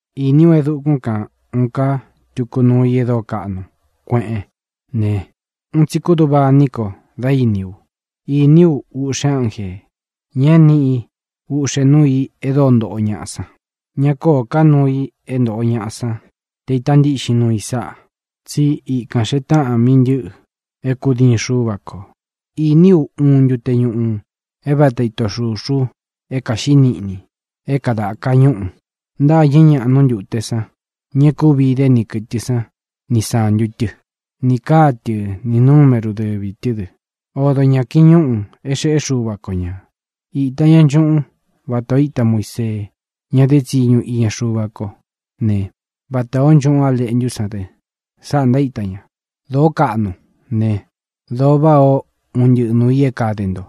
Īní u e dukún kān uun ká tuku nuu i e dóo kaꞌnu kueꞌén ne, un tsi kúduꞌva iní ko dá īní u. Īní u uꞌxe ánjē, ña é niꞌi uꞌxe núu i e dóo ntoꞌo ñaꞌa san. Ña kóō ká nuu i é ntoꞌo ñaꞌa san te īta ntíꞌxin nuu i sáꞌā, tsí ikān xee táꞌan mí ntɨ̄ꞌɨ é kūdiin Xúva kō. Īní u uun ntute ñuꞌu é vata ito xūxu é kāxiꞌí niꞌni é kadāka ñúꞌu. Ntâñɨ́ ñaꞌa nú ntute san, ña e kúvi idé ni kɨ̄tɨ san ni sántu tɨ́, nī káa tɨ nī numéru dɨvī tɨ́ dɨ. Odo ñā kiñúꞌū é xeꞌé Xuva ko ñā. Īta ña nchuꞌún vatā o íta Muisee, ña dé tsiñu iña Xuva kó ne, vatā ó nchuꞌún A Leꞌntú san dɨ. Sáꞌā ntaíta ña: Dōó kaꞌnu ne, dōo váꞌā ó un ntɨꞌɨ nuū i é kade nto.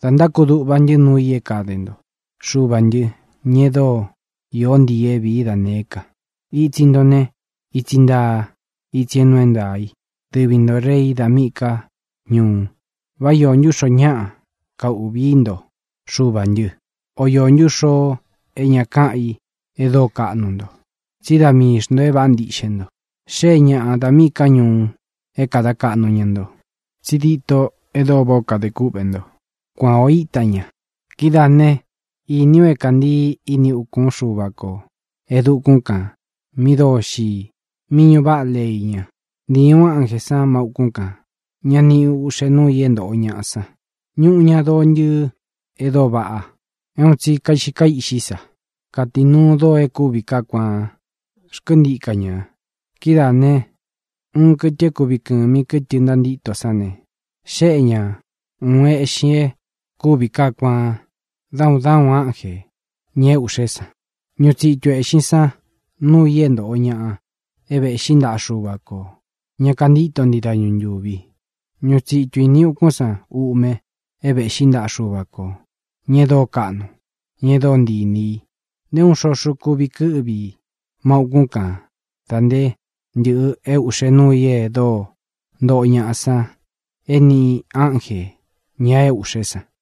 Da ntákuduꞌva ntɨ́ nuu i é kade nto, Xuvā ntɨ́, ña e dóo īó ntii ī é vīí da nēé ka. Itsi nto ne, itsi ntaa, itsi é nuu é ntaā i. Dɨvi ntō Rei da míꞌī ká ñuu. ¿Vá iō ntú xoo é ña káūꞌví i nto, Xuvā ntɨ? ¿O iō ntú xoo é ña káꞌan i e dóo kaꞌnu nto? Tsí da mii xntō é vāꞌá ntiꞌxe nto. Xée ñāꞌa da míꞌī ká ñuu é kāda kaꞌnu ña nto. Tsi dîto e dóo váꞌā ó kade kúꞌvē nto, kuan ō íta ña. Kidáā né, īní u é kāntii ini ukún Xuva kō e dukún kān mi dóo xii, mí ñūꞌu váꞌa lei ña. Ntīi uꞌxe ánjē san má ūkún kān, ña niꞌi uꞌxe núu i é ntōꞌo ñaꞌa san. Ñuꞌu ña doo ntɨɨ e dóo vaꞌa, é un tsi kaiꞌxi kaíꞌxí sa. Katīnuu doo e kúvi kaá kuaan xkɨ́ntika ña. Kidáā ne, uun kɨtɨ é kuvi kɨ̄mi kɨtɨ ntantíto sán ne, xéꞌe ña ūun eꞌxin e kúvi kaá kuaan dá un dá un ánjē, ña é ūꞌxé san. Ñuꞌu tsitu ēꞌxin san núu i é ntōꞌo ñaꞌa é vēꞌxí ntaꞌa Xuva kō, ña kantíto ntii dañu ntūvi. Ñuꞌu tsitu ini ukún san uꞌme é vēꞌxí ntaꞌa Xuva kō, ña e dóo kaꞌnu, ña e dóo ntii inī i. Nté uun xoxo kuvi kɨ́ꞌvi i má ūkún kān da nté ntɨ̄ꞌɨ é ūꞌxe núu i e dóo ntoꞌo ñaꞌa san é niꞌi ánjē, ña é ūꞌxé san.